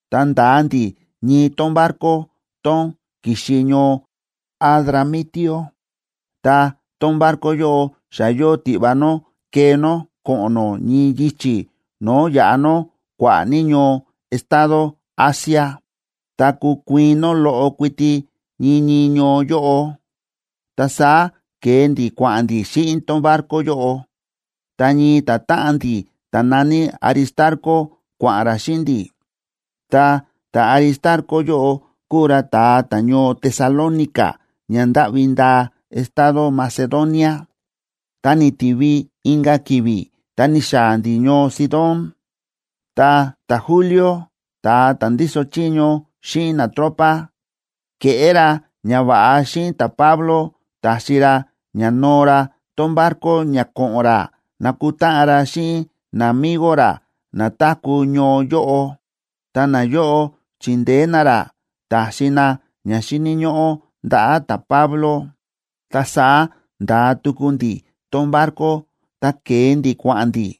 Ta nda̱a ndi̱ ñii tón barco tón ki̱xi ñoo Adramitio. Ta tón barco yóꞌo xa yóo tiꞌva nó kee nó ko̱ꞌo̱n nó ñii yichi̱ no̱o̱ yaꞌa nó kua̱ꞌa̱ ní ñoo estado Asia, ta kukuiin nó loꞌo kuiti ñii ñii ñoo yóꞌo. Ta saá ke̱e ndi̱ kua̱ꞌa̱n ndí xíꞌin tón barco yóꞌo. Ta ñii ta̱táꞌan ndi̱ ta̱ na̱ní Aristarco kua̱ꞌa̱n ra xíꞌin ndi̱. Ta ta̱Aristarco yóꞌo kúu ra ta̱a ta̱ñoo Tesalónica ña ndáꞌvi ndaa estado Macedonia. Ta ni̱tivi inka̱ ki̱vi̱ ta ni̱xaa̱ ndi̱ ñoo Sidón. Ta ta̱Julio, ta̱a ta̱ ndíso chiño xíꞌin natropa, ke̱ꞌé ra ñava̱ꞌa xíꞌin ta̱Pablo ta̱xi ra ña noo ra tón barco ña ko̱ꞌo̱n ra nakutáꞌan ra xíꞌin namigo ra na táku̱ ñoo yóꞌo. Ta nayóꞌo chi̱ndeé na ra, ta̱xi na ña xíni̱ ñóꞌó ndaꞌa̱ ta̱Pablo. Ta saá nda̱a tuku ndi̱ tón barco ta ke̱e ndi̱ kua̱ꞌa̱n ndi̱.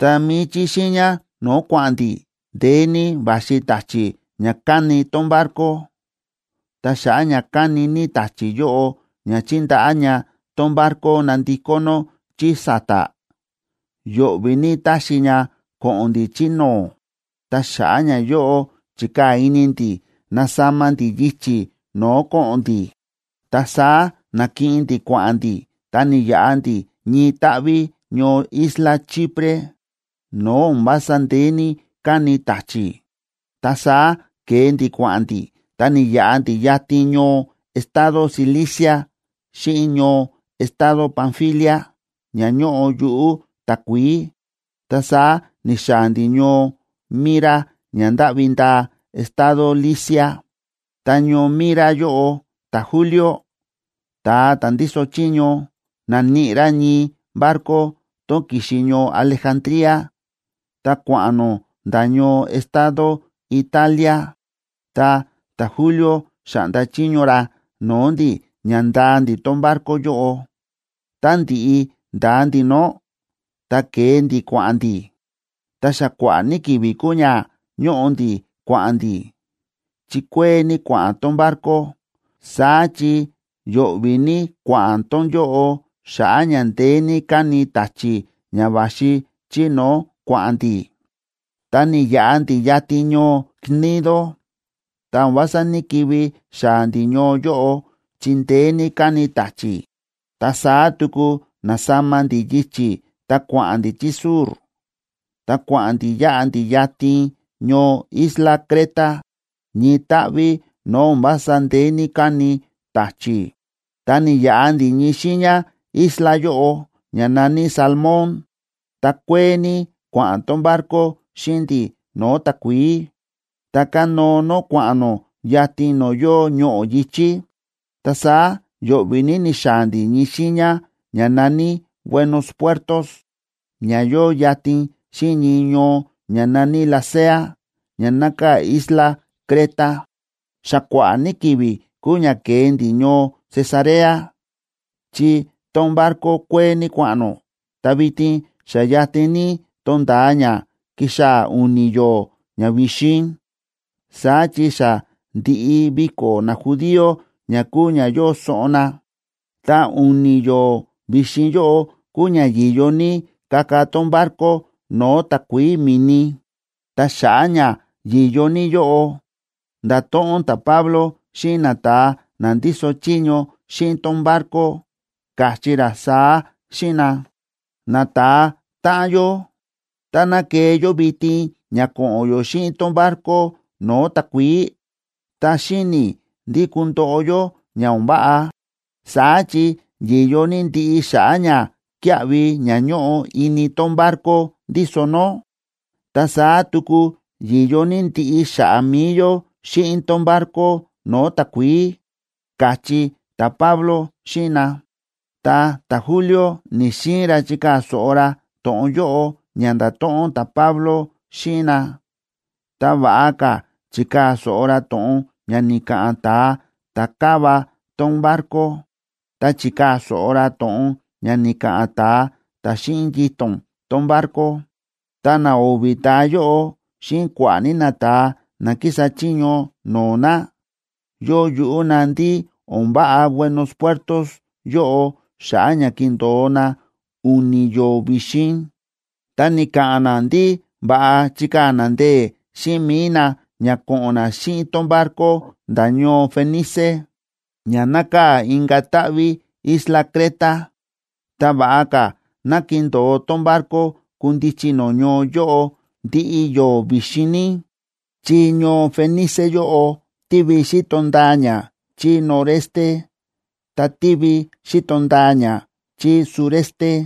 Ta mi̱i chí xiiña no̱o̱ kua̱ꞌa̱n ndi̱, ndeé ní va̱xi ta̱chi̱ ña káni tón barco, ta xa̱ꞌa̱ ña káni ní ta̱chi̱ yóꞌo ña chíndaꞌá ña tón barco nandikó nó chí sa̱ta̱, yo̱ꞌvi̱ ní táxi ña ko̱ꞌo̱n ndi̱ chí no̱o̱. Ta xa̱ꞌa̱ ñayóꞌo chi̱kaa̱ ini ndi̱ nasama ndi̱ yichi̱ no̱o̱ ko̱ꞌo̱n ndi̱. Ta saá na̱kiꞌin ndi̱ kua̱ꞌa̱n ndi̱ ta ni̱yaꞌa ndi̱ ñii táꞌví ñoo isla Chipre no̱o̱ o̱n vása ndeé ní káni ta̱chi̱. Ta saá ke̱e ndi̱ kua̱ꞌa̱n ndi̱, ta ni̱yaꞌa ndi̱ yatin ñoo estado Cilicia xíꞌin ñoo estado Panfilia, ña ñóꞌo yuꞌu̱ takuií, ta saá ni̱xaa̱ ndi̱ ñoo Mira ña ndáꞌvi ndaa estado Licia. Ta ñoo Mira yóꞌo ta̱Julio, ta̱a ta̱ ndíso chiño, na̱níꞌi ra ñii barco tón ki̱xi ñoo Alejandría ta kua̱ꞌa̱n nó nda̱ ñoo estado Italia. Ta ta̱Julio xa̱ꞌnda chiño ra no̱o̱ ndi̱ ña ndaa ndi̱ tón barco yóꞌo. Tá ndi̱ꞌi nda̱a ndi̱ nó, ta ke̱e ndi̱ kua̱ꞌa̱n ndi̱. Ta xa kua̱ꞌa̱ ní ki̱vi̱ kúu ña ñóꞌo ndi̱ kua̱ꞌa̱n ndi̱, chi kuee ní kua̱ꞌa̱n tón barco, saá chi yo̱ꞌvi̱ ní kua̱ꞌa̱n tón yóꞌo xa̱ꞌa̱ ña ndeé ní káni ta̱chi̱ ña va̱xi chí no̱o̱ kua̱ꞌa̱n ndi̱. Ta ni̱yaꞌa ndi̱ yatin ñoo Gnido, ta o̱n vása ní‑kivi xaa̱ ndi̱ ñoo yóꞌo, chi ndeé ní káni ta̱chi̱. Ta saá tuku na̱sama ndi̱ yichi̱ ta kua̱ꞌa̱n ndi̱ chí sur, ta kua̱ꞌa̱n ndi̱ yáꞌa ndi̱ yatin ñoo isla Creta, ñii táꞌví no̱o̱ o̱n vása ndeé ní káni ta̱chi̱, ta ni̱yaꞌa ndi̱ ñii xiiña isla yóꞌo, ña na̱ní Salmón. Ta kuee ní kua̱ꞌa̱n tón barco xíꞌin ndi̱ no̱o̱ takuií, ta kánóo nó kua̱ꞌa̱n nó yatin no̱o̱ yóo ñoꞌo̱ yi̱chí. Ta saá yo̱ꞌvi̱ ní ni̱xaa̱ ndi̱ ñii xiiña ña na̱ní Buenos Puertos, ña yóo yatin xíꞌin ñii ñoo ña na̱ní Lasea ña nákaa̱ isla Creta. Xa kua̱ꞌa̱ ní ki̱vi̱ kúu ña ke̱e ndi̱ ñoo Cesarea, chi tón barco kuee ní kua̱ꞌa̱n nó, ta vitin xa yatin ní tonda̱a ña kixaa̱ u̱ni̱ yo̱o̱ ña vi̱xin, saá chi xa ndi̱ꞌi viko̱ najudío ña kúu ña yóo soꞌon na. Ta u̱ni̱ yo̱o̱ vi̱xin yóꞌo kúu ña yi̱yo ní kaka tón barco no̱o̱ takuií mi̱ni. Ta xa̱ꞌa̱ ña yi̱yo ní yóꞌo, nda̱to̱ꞌon ta̱Pablo xíꞌin nata̱a na ndíso chiño xíꞌin tón barco, káchí ra saá xíꞌin na: ―Nata̱a táꞌan yó, táná kee yó vitin ña ko̱ꞌo̱n yó xíꞌin tón barco no̱o̱ takuií, ta xíni̱ i̱ ndí kundoꞌo yó ña o̱n váꞌa. Saá chi yi̱yo ní ndiꞌi xa̱ꞌa̱ ñakíaꞌvi ña ñóꞌo ini tón barco ndíso nó, ta saá tuku yi̱yo ní ndiꞌi xa̱ꞌa̱ mi̱i yó xíꞌin tón barco no̱o̱ takuií ―káchí ta̱Pablo xíꞌin na. Ta ta̱Julio ni̱‑xiin ra chikaa̱ so̱ꞌo ra to̱ꞌon yóꞌo ña nda̱to̱ꞌon ta̱Pablo xíꞌin na, ta va̱ꞌa ka̱ chi̱kaa̱ so̱ꞌo ra to̱ꞌon ña ni̱ka̱ꞌa̱n ta̱a ta̱ káva tón barco, ta chi̱kaa̱ so̱ꞌo ra to̱ꞌon ña ni̱ka̱ꞌa̱n ta̱a ta̱ xíꞌin yito̱n tón barco. Ta na o̱vi̱ ta̱a yóꞌo xíꞌin kua̱ꞌa̱ ní nata̱a na kísa chiño no̱o̱ na, yóo yuꞌú na ndí o̱n váꞌa Buenos Puertos yóꞌo xa̱ꞌa̱ ña kindo̱o na u̱ni̱ yo̱o̱ vi̱xin. Ta ni̱ka̱ꞌa̱n na ndí va̱ꞌa chikaa̱ na ndee̱ xíꞌin mi̱i na ña ko̱ꞌo̱n na xíꞌin tón barco nda̱ ñoo Fenice, ña nákaa̱ inka̱ táꞌví isla Creta, ta va̱ꞌa ka̱ ná kindo̱o tón barco kundichi nó ñoo yóꞌo ndiꞌi yo̱o̱ vi̱xin ní, chí ñoo Fenice yóꞌo tívi xíto ndaa ña chí noreste ta tívi xíto ndaa ña chí sureste.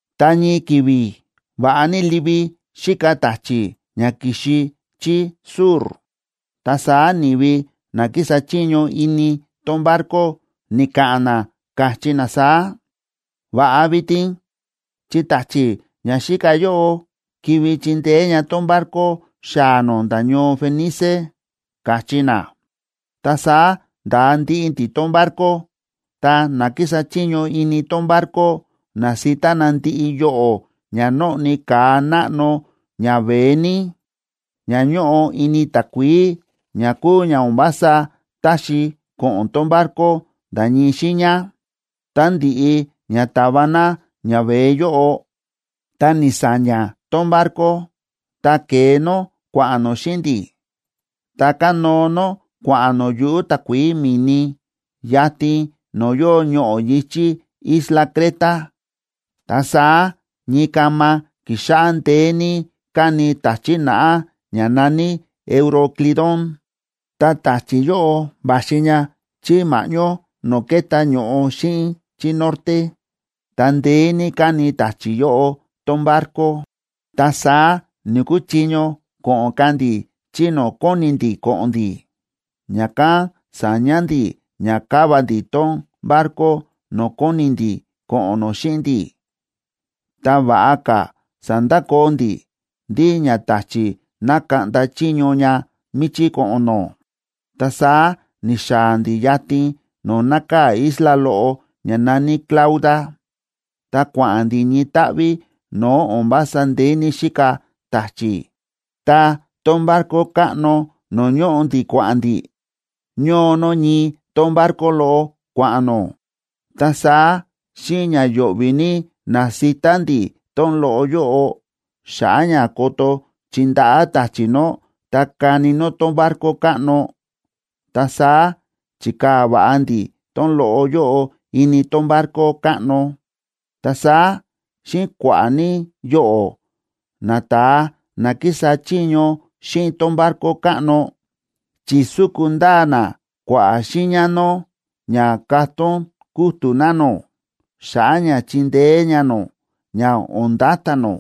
Ta ñii ki̱vi̱ va̱ꞌa ní livi xíka ta̱chi̱ ña ki̱xi chí sur, ta saá ni̱vi na kísa chiño ini tón barco, ni̱ka̱ꞌa̱n na, káchí na saá: ―Va̱ꞌa vitin, chi ta̱chi̱ ña xíka yóꞌo kivi chindeé ña tón barco xaa̱ nó nda̱ ñoo Fenice ―káchí na. Ta saá nda̱a ndiꞌi ndi̱ tón barco, ta na kísa chiño ini tón barco na̱sita na ndiꞌi yoꞌo̱ ña nóꞌni ka̱a náꞌno ñaveé ní, ña ñóꞌo ini takuií, ña kúu ña o̱n vása táxi ko̱ꞌo̱n tón barco nda̱ ñii xiiña. Tá ndi̱ꞌi ña ta̱va na ñaveé yóꞌo, ta ni̱sa̱ña̱ tón barco, ta ke̱e nó kua̱ꞌa̱n nó xíꞌin ndi̱, ta kánóo nó, kua̱ꞌa̱n nó yuꞌu̱ takuií mi̱ni, yatin no̱o̱ yóo ñoꞌo̱ yi̱chí isla Creta. Ta saá ñii kama ki̱xáꞌá ndeé ní káni ta̱chi̱ naꞌá ña na̱ní Euroclidón. Ta ta̱chi̱ yóꞌo va̱xi ña chí ma̱ꞌñó no̱o̱ kéta ño̱ꞌo xíꞌin chí norte, ta ndeé ní káni ta̱chi̱ yóꞌo tón barco. Ta saá ni̱‑kuchiño ko̱ꞌo̱n ka̱ ndi̱ chí no̱o̱ kóni ndi̱ ko̱ꞌo̱n ndi̱. Ña̱kán sa̱ña ndi̱ ña káva ndi̱ tón barco no̱o̱ kóni ndi̱ ko̱ꞌo̱n nó xíꞌin ndi̱, ta va̱ꞌa ka̱ sa̱ndakoo ndi̱ ndí ña ta̱chi̱ ná kaꞌnda chiño ña míchí ko̱ꞌo̱n nó. Ta saá ni̱xaa̱ ndi̱ yatin no̱o̱ nákaa̱ isla loꞌo ña na̱ní Clauda, ta kua̱ꞌa̱n ndi̱ ñii táꞌví no̱o̱ o̱n vása ndeé ní xíka ta̱chi̱. Ta tón barco káꞌno no̱o̱ ñóꞌo ndi̱ kua̱ꞌa̱n ndi̱, ñóo nó ñii tón barco loꞌo, kua̱ꞌa̱n nó, ta saá xíꞌin ña yo̱ꞌvi̱ ní na̱sita ndi̱ tón loꞌo yóꞌo, xa̱ꞌa̱ ña ko̱to̱ chindaꞌá ta̱chi̱ nó, ta kani nó tón barco káꞌno. Ta saá chi̱kaa̱ va̱ꞌa ndi̱ tón loꞌo yóꞌo ini tón barco káꞌno. Ta saá xíꞌin kua̱ꞌa̱ ní yoꞌo̱, nata̱a na kísa chiño xíꞌin tón barco káꞌno, chi̱súku ndaa na kua̱ꞌa̱ xiiña nó ña katón kútu̱ na nó, xa̱ꞌa̱ ña chindeé ña nó ña o̱n nda̱ta̱ nó.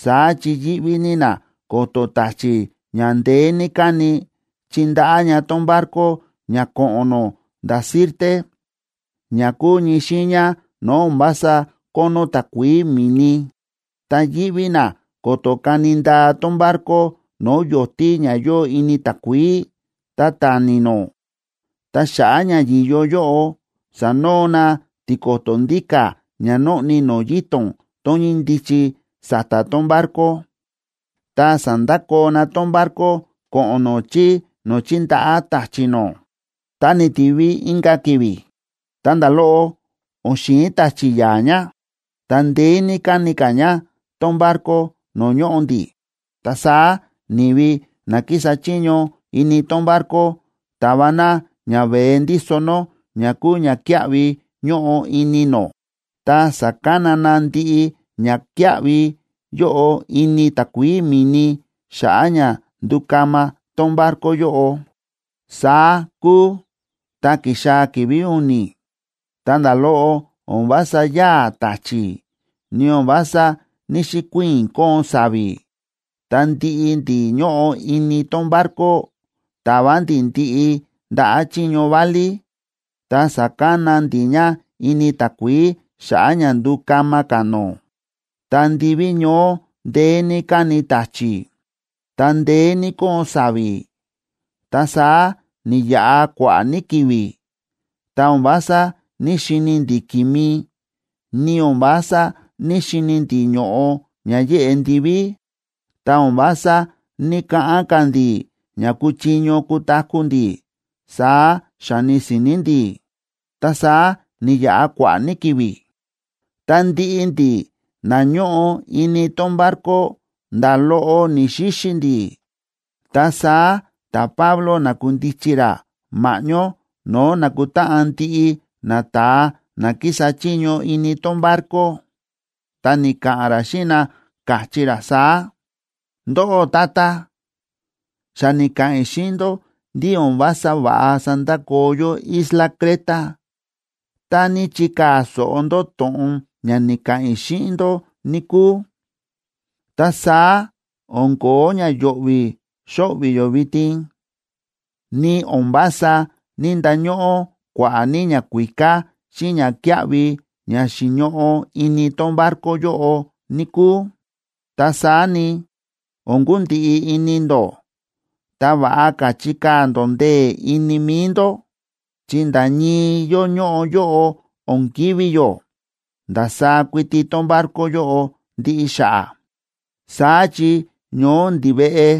Saá chi yíꞌví ní na ko̱to̱ ta̱chi̱ ña ndeé ní káni, chindaꞌá ña tón barco ña ko̱ꞌo̱n nó nda̱ Sirte, ña kúu ñii xiiña no̱o̱ o̱n vása kónó takuií mi̱ni, ta yíꞌví na ko̱to̱ kani ndaa tón barco no̱o̱ yo̱tí ña yóo ini takuií, ta tani nó. Ta xa̱ꞌa̱ ña yi̱yo yóꞌo, sa̱noo na tiko̱to̱ ndíka̱ ña nóꞌni no̱o̱ yito̱n tón ñíndichi sa̱ta̱ tón barco, ta sa̱ndakoo na tón barco ko̱ꞌo̱n nó chí no̱o̱ chindaꞌá ta̱chi̱ nó. Ta ni̱tivi inka̱ ki̱vi̱, ta nda̱ loꞌo o̱n xi̱in ta̱chi̱ ya̱a̱ ña, ta ndeé ní káni ka̱ ña tón barco no̱o̱ ñóꞌo ndi̱. Ta saá ni̱vi na kísa chiño ini tón barco ta̱va na ñaveé ndíso nó ña kúu ñakíaꞌvi ñóꞌo ini nó, ta sa̱kana na ndiꞌi ñakíaꞌvi yóꞌo ini takuií mi̱ni xa̱ꞌa̱ ña ndukama tón barco yóꞌo. Saá kúu, ta ki̱xaa̱ ki̱vi̱ u̱ni̱, ta nda̱ loꞌo o̱n vása yáa̱ ta̱chi̱, ni o̱n vása ní‑xikuiin kóon sa̱vi̱, ta ndiꞌi ndi̱ ñóꞌo ini tón barco, ta̱va ndi̱ ndiꞌi ndaꞌa̱ chiño válí, ta sa̱kana ndi̱ ña ini takuií xa̱ꞌa̱ ña ndukama ka̱ nó. Ta ndiví ñoó ndeé ní káni ta̱chi̱, ta ndeé ní kóon sa̱vi̱. Ta saá ni̱yaꞌa kua̱ꞌa̱ ní ki̱vi̱, ta o̱n vása ní‑xini ndi̱ ki̱mi, ni o̱n vása ní‑xini ndi̱ ño̱ꞌo ña yéꞌe ndiví. Ta o̱n vása ní‑kaꞌán ka̱ ndi̱ ña kuchiño kutaku̱ ndi̱, saá xáni si̱ni̱ ndi̱. Ta saá ni̱yaꞌa kua̱ꞌa̱ ní ki̱vi̱, ta ndiꞌi ndi̱ na ñóꞌo ini tón barco nda̱ loꞌo ni̱‑xixi ndi̱. Ta saá ta̱Pablo na̱kundichi ra ma̱ꞌñó no̱o̱ nákutáꞌan ndiꞌi nata̱a na kísa chiño ini tón barco, ta ni̱ka̱ꞌa̱n ra xíꞌin na, káchí ra saá: ―Ndóꞌó tata, xa ni̱ka̱ꞌa̱n i̱ xíꞌin ndó ndí o̱n vása va̱ꞌa sandakoo yó isla Creta. Tá ní chikaa̱ so̱ꞌo ndó to̱ꞌon ña ni̱ka̱ꞌa̱n i̱ xíꞌin ndó, níkúu, ta saá o̱n kóo ña yo̱ꞌvi̱ xóꞌvi̱ yó vitin, ni o̱n vása ní‑ndañóꞌó kua̱ꞌa̱ ní ñakuíká xíꞌin ñakíaꞌvi ña xi̱ñoꞌo ini tón barco yóꞌo, níkúu. Ta saá ni, o̱n kundiꞌi ini ndó, ta va̱ꞌa ka̱ chikaa̱ ndó ndee̱ ini mi̱i ndó, chi nda̱ ñii yó ñóꞌo yóꞌo o̱n kivi̱ yó, ndasaá kuiti tón barco yóꞌo ndiꞌi xa̱ꞌa̱. Saá chi ñoó ndiveꞌe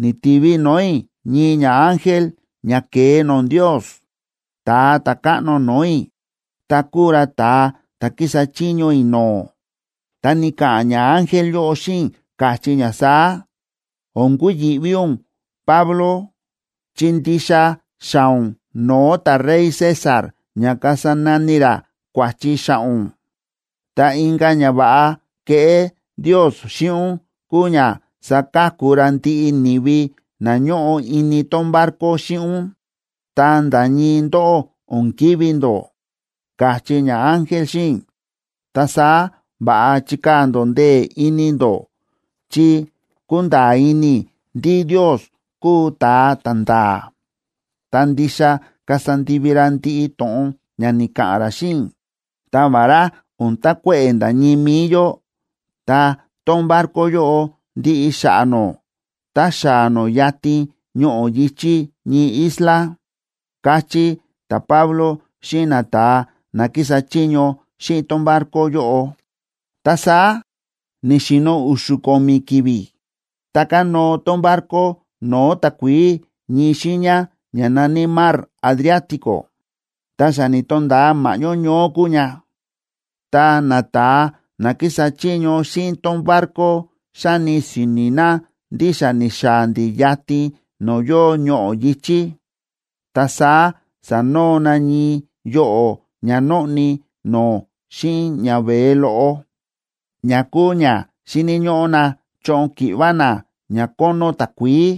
ni̱tivi no̱o̱ i̱ ñii ñaángel ña ke̱e no̱o̱ Ndios, Ta̱a Ta̱káꞌno no̱o̱ i̱, ta kúu ra ta̱a ta̱ kísa chiño i̱ no̱o̱. Ta ni̱ka̱ꞌa̱n ñaángel yóꞌo xíꞌin i̱, káchí ña saá: “O̱n kuyi̱ꞌví ún, Pablo, chi ndixa xaa̱ ún no̱o̱ ta̱rey César ña kasa nani ra kua̱chi xa̱ꞌa̱ ún. Ta inka̱ ñava̱ꞌa keꞌé Ndios xíꞌin ún kuu ña saka̱ku ra ndiꞌi ni̱vi na ñóꞌo ini tón barco xíꞌin ún, ta nda̱ ñii ndóꞌó o̱n kivi̱ ndó”, káchí ñaángel xíꞌin i̱. Ta saá va̱ꞌa chikaa̱ ndó ndee̱ ini ndó, chi kúnda̱a̱ ini i̱ ndí Ndios kúu ta̱a ta̱nda̱a̱, ta ndixa kasa ndivi ra ndiꞌi to̱ꞌon ña ni̱ka̱ꞌa̱n ra xíꞌin i̱. Ta vará o̱n takuéꞌe̱ nda̱ ñii mi̱i yó, ta tón barco yóꞌo ndiꞌi xa̱ꞌa̱ nó tá xaa̱ nó yatin ñoꞌo̱ yi̱chí ñii isla ―káchí ta̱Pablo xíꞌin nata̱a na kísa chiño xíꞌin tón barco yóꞌo. Ta saá ni̱xi̱no̱ u̱xu̱ ko̱mi̱ ki̱vi̱, ta kánóo tón barco no̱o̱ takuií ñii xiiña ña na̱ní Mar Adriático. Ta xa ni̱to̱nda̱a ma̱ꞌñó ñoó kúu ña, ta nata̱a na kísa chiño xíꞌin tón barco xáni si̱ni̱ na ndí xa ni̱xaa̱ ndi̱ yatin no̱o̱ yóo ñoꞌo̱ yi̱chí. Ta saá sa̱noo na ñii yoꞌo̱ ña nóꞌni no̱o̱ xíꞌin ñaveé loꞌo, ña kúu ña xíni̱ ñóꞌó na choꞌon ki̱ꞌva na ña kónó takuií.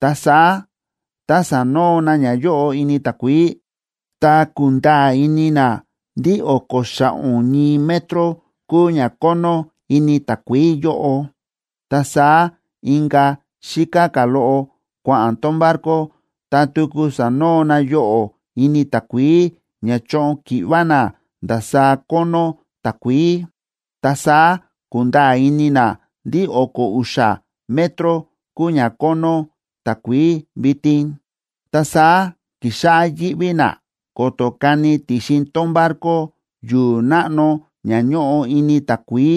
Ta saá tá sa̱noo na ñayóꞌo ini takuií, ta ku̱nda̱a̱ ini na ndí o̱ko̱ xa̱ꞌo̱n ñii metro kúu ña kónó ini takuií yóꞌo. Ta saá inka̱ xíká ka̱ loꞌo kua̱ꞌa̱n tón barco, ta tuku sa̱noo na yoꞌo̱ ini takuií ña choꞌon ki̱ꞌva na ndasaá kónó takuií. Ta saá ku̱nda̱a̱ ini na ndí o̱ko̱ u̱xa̱ metro kúu ña kónó takuií vitin. Ta saá ki̱xáꞌá yíꞌví na ko̱to̱ kani ti̱xin tón barco yu̱u̱ náꞌno ña ñóꞌo ini takuií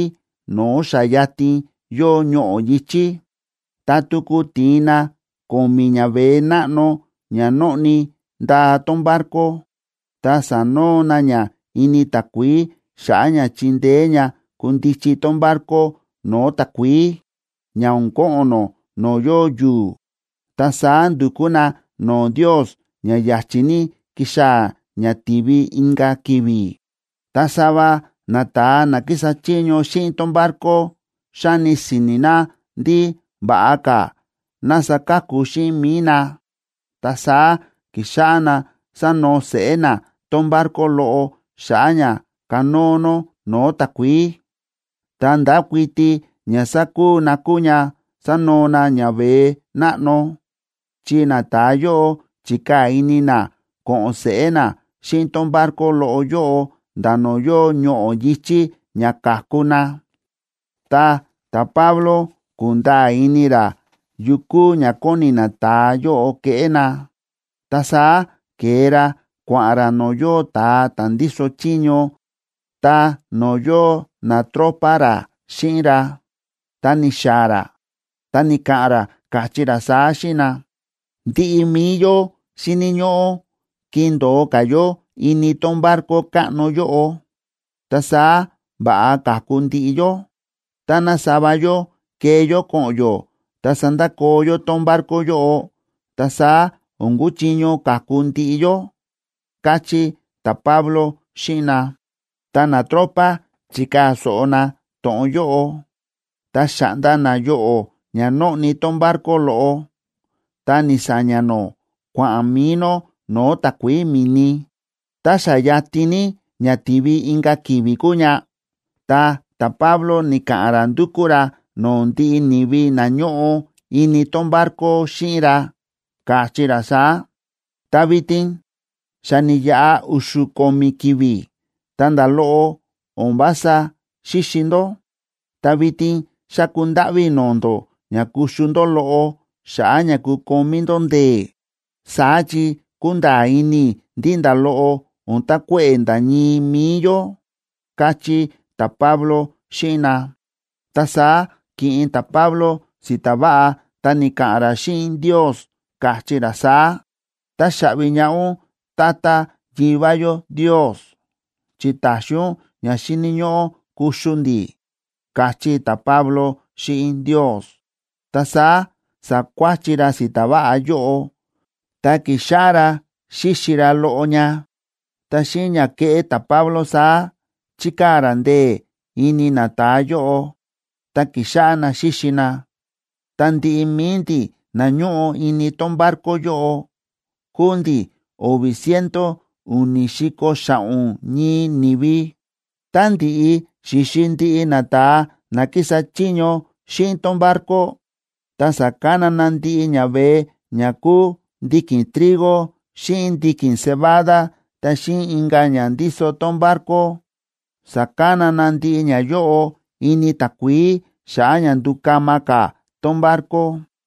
no̱o̱ xa yatin yóo ñoꞌo̱ yi̱chí. Ta tuku ti̱in na ko̱mi̱ ñaveé náꞌno ña nóꞌni ndaa tón barco ta sa̱noo na ña ini takuií xa̱ꞌa̱ ña chindeé ña kundichi tón barco no̱o̱ takuií, ña o̱n ko̱ꞌo̱n nó no̱o̱ yóo yu̱u̱. Ta saá ndu̱kú na no̱o̱ Ndios ña ya̱chi̱ ní kixaa̱ ña tivi inka̱ ki̱vi̱. Ta sava nata̱a na kísa chiño xíꞌin tón barco xáni si̱ni̱ na ndí va̱ꞌa ka̱ ná saka̱ku xíꞌin mi̱i na. Ta saá ki̱xáꞌá na sánoo seꞌé na tón barco loꞌo xa̱ꞌa̱ ña kanóo nó no̱o̱ takuií. Ta ndákuiti ña sákuu na kúu ña sánoo na ñaveé náꞌno, chi nata̱a yóꞌo chi̱kaa̱ ini na ko̱ꞌo̱n seꞌé na xíꞌin tón barco loꞌo yóꞌo nda̱ no̱o̱ yóo ñoꞌo̱ yi̱chí ña ka̱ku na. Ta ta̱Pablo ku̱nda̱a̱ ini ra yu kúu ña kóni nata̱a yóꞌo keꞌé na, ta saá ke̱e ra kua̱ꞌa̱n ra no̱o̱ yóo ta̱a ta̱ ndíso chiño ta no̱o̱ yóo natropa ra xíꞌin ra. Ta ni̱xaa̱ ra, ta ni̱ka̱ꞌa̱n ra, káchí ra saá xíꞌin na: ―Ndiꞌi mi̱i yó xíni̱ ñóꞌó kindo̱o ka̱ yó ini tón barco káꞌno yóꞌo, ta saá va̱ꞌa ka̱ku ndiꞌi yó. Táná sava yó kee yó ko̱ꞌo̱n yó ta sandakoo yó tón barco yóꞌo, ta saá o̱n kuchiño ka̱ku ndiꞌi yó ―káchí ta̱Pablo xíꞌin na. Ta natropa chi̱kaa̱ so̱ꞌo na to̱ꞌon yóꞌo, ta xa̱ꞌnda na yoꞌo̱ ña nóꞌni tón barco loꞌo, ta ni̱sa̱ña̱ nó, kua̱ꞌa̱n mi̱i nó no̱o̱ takuií mi̱ni. Ta xa yatin ní ña tivi inka̱ ki̱vi̱ kúu ña, ta ta̱Pablo ni̱ka̱ꞌa̱n ra ndu̱kú ra no̱o̱ ndiꞌi ni̱vi na ñóꞌo ini tón barco xíꞌin ra, káchí ra saá: ―Ta vitin xa ni̱yaꞌa u̱xu̱ ko̱mi̱ ki̱vi̱ ta nda̱ loꞌo o̱n vása xíxi ndó. Ta vitin xáku ndáꞌví i̱ no̱o̱ ndó ña kuxu ndó loꞌo xa̱ꞌa̱ ña kukomí ndó ndee̱, saá chi kúnda̱a̱ ini i̱ ndí nda̱ loꞌo o̱n takuéꞌe̱ nda̱ ñii mi̱i yó ―káchí ta̱Pablo xíꞌin na. Ta saá ki̱ꞌin ta̱Pablo si̱ta̱ váꞌa ta ni̱ka̱ꞌa̱n ra xíꞌin Ndios, káchí ra saá: ―Táxaꞌvi ñaꞌá ún, Tata Yivá yó Ndios, chi táxi ún ña xíni̱ ñóꞌó kuxu ndi̱ ―káchí ta̱Pablo xíꞌin Ndios. Ta saá sa̱kuáchi ra si̱ta̱ váꞌa yóꞌo, ta ki̱xáꞌá ra xíxi ra loꞌo ña. Ta xíꞌin ña kéꞌé ta̱Pablo saá, chi̱kaa̱ ra ndee̱ ini nata̱a yóꞌo, ta ki̱xáꞌá na xíxi na. Ta ndiꞌi mi̱i ndi̱ na ñóꞌo ini tón barco yóꞌo kúu ndi̱ o̱vi̱ ciento u̱ni̱ si̱ko̱ xa̱ꞌo̱n ñii ni̱vi. Tá ndi̱ꞌi xi̱xi ndiꞌi nata̱a na kísa chiño xíꞌin tón barco, ta sa̱kana na ndiꞌi ñaveé ña kúu ndiki̱n trigo xíꞌin ndiki̱n cebada ta xíꞌin inka̱ ña ndíso tón barco, sa̱kana na ndiꞌi ñayóꞌo ini takuií xa̱ꞌa̱ ña ndukama ka̱ tón barco.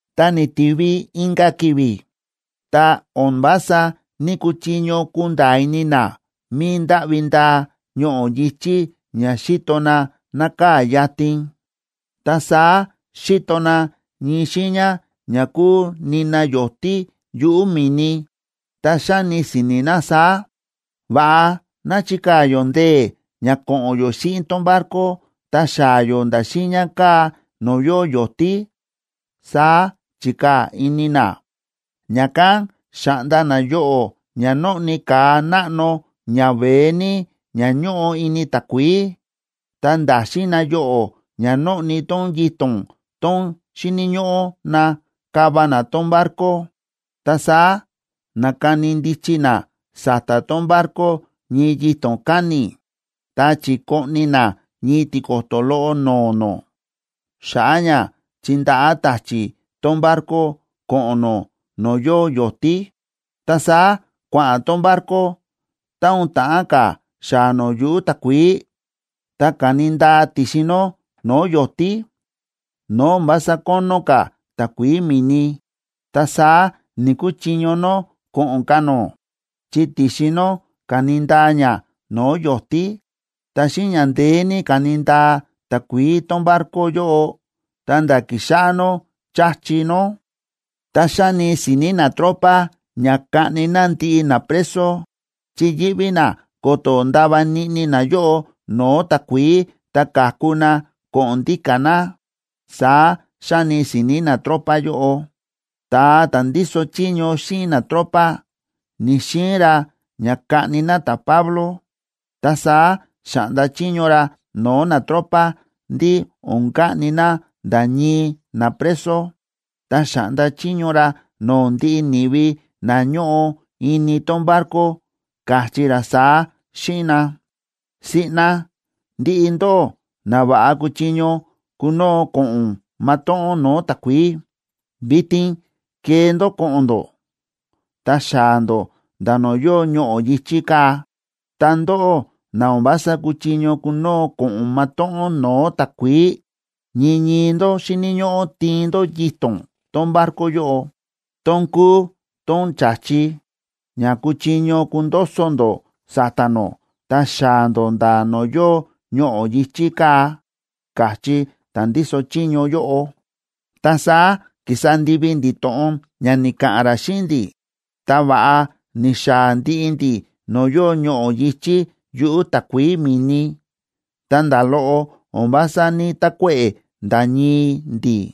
Ta ni̱tivi inka̱ ki̱vi̱, ta o̱n vása ní‑kuchiño kunda̱a̱ ini na mi̱i ndáꞌvi ndaa ñoꞌo̱ yi̱chí ña xíto na nákaa̱ yatin. Ta saá xi̱to na ñii xiiña ña kúu nina yo̱tí yuꞌu̱ mi̱ni, ta xáni si̱ni̱ na saá: Va̱ꞌa ná chikaa̱ yó ndee̱ ña ko̱ꞌo̱n yó xíꞌin tón barco, ta xaa̱ yó nda̱ xiiña kaa̱ no̱o̱ yóo yo̱tí, saá chi̱kaa̱ ini na. Ña̱kán xa̱ꞌnda na yoꞌo̱ ña nóꞌni ka̱a náꞌno ñaveé ní ña ñóꞌo ini takuií, ta nda̱xin na yoꞌo̱ ña nóꞌni tón yito̱n tón xíni̱ ñóꞌó na káva na tón barco. Ta saá na̱kani ndichi na sa̱ta̱ tón barco ñii yito̱n káni̱, ta chi̱koꞌni na ñii tiko̱to̱ loꞌo no̱o̱ nó, xa̱ꞌa̱ ña chindaꞌá ta̱chi̱ tón barco ko̱ꞌo̱n nó no̱o̱ yóo yo̱tí. Ta saá kua̱ꞌa̱n tón barco, ta o̱n ta̱ꞌán ka̱ xaa̱ nó yuꞌu̱ takuií, ta ka̱ni ndaa ti̱xin nó no̱o̱ yo̱tí, no̱o̱ o̱n vása kónó ka̱ takuií mi̱ni. Ta saá ni̱‑kuchiño nó ko̱ꞌo̱n ka̱ nó, chi ti̱xin nó ka̱ni ndaa ña no̱o̱ yo̱tí. Ta xíꞌin ña ndeé ní káni ndaa takuií tón barco yóꞌo ta nda̱ ki̱xáꞌá nó cha̱chi nó. Ta xáni si̱ni̱ natropa ña kaꞌni na ndiꞌi napreso, chi yíꞌví na ko̱to̱ ndava niꞌni nayóꞌo no̱o̱ takuií ta ka̱ku na ko̱ꞌo̱n ndíka̱ na, saá xáni si̱ni̱ natropa yóꞌo. Ta ta̱a ta̱ ndíso chiño xíꞌin natropa ni̱‑xiin ra ña kaꞌni na ta̱Pablo, ta saá xa̱ꞌnda chiño ra no̱o̱ natropa ndí o̱n kaꞌni na nda̱ ñii napreso. Ta xa̱ꞌnda chiño ra no̱o̱ ndiꞌi ni̱vi na ñóꞌo ini tón barco, káchí ra saá xíꞌin na: ―Siꞌna ndiꞌi ndó na va̱ꞌa kúchiño kunoo ko̱ꞌo̱n matóꞌón no̱o̱ takuií, vitin kee ndó ko̱ꞌo̱n ndó, ta xaa̱ ndó nda̱ no̱o̱ yóo ñoꞌo̱ yi̱chí kaa̱. Ta ndóꞌó na o̱n vása kúchiño kunoo ko̱ꞌo̱n matóꞌón no̱o̱ takuií, ñii ñii ndó xíni̱ ñóꞌó tiin ndó yito̱n tón barco yóꞌo, tón kúu tón cha̱chi, ña kuchiño kundoso ndó sa̱ta̱ nó, ta xaa̱ ndó nda̱ no̱o̱ yóo ñoꞌo̱ yi̱chí kaa̱ ―káchí ta̱ ndíso chiño yóꞌo. Ta saá ki̱sa ndivi ndi̱ to̱ꞌon ña ni̱ka̱ꞌa̱n ra xíꞌin ndi̱, ta va̱ꞌa ni̱xaa̱ ndiꞌi ndi̱ no̱o̱ yóo ñoꞌo̱ yi̱chí yuꞌu̱ takuií mi̱ni, ta nda̱ loꞌo o̱n vása ní‑takuéꞌe̱ nda̱ ñii ndi̱.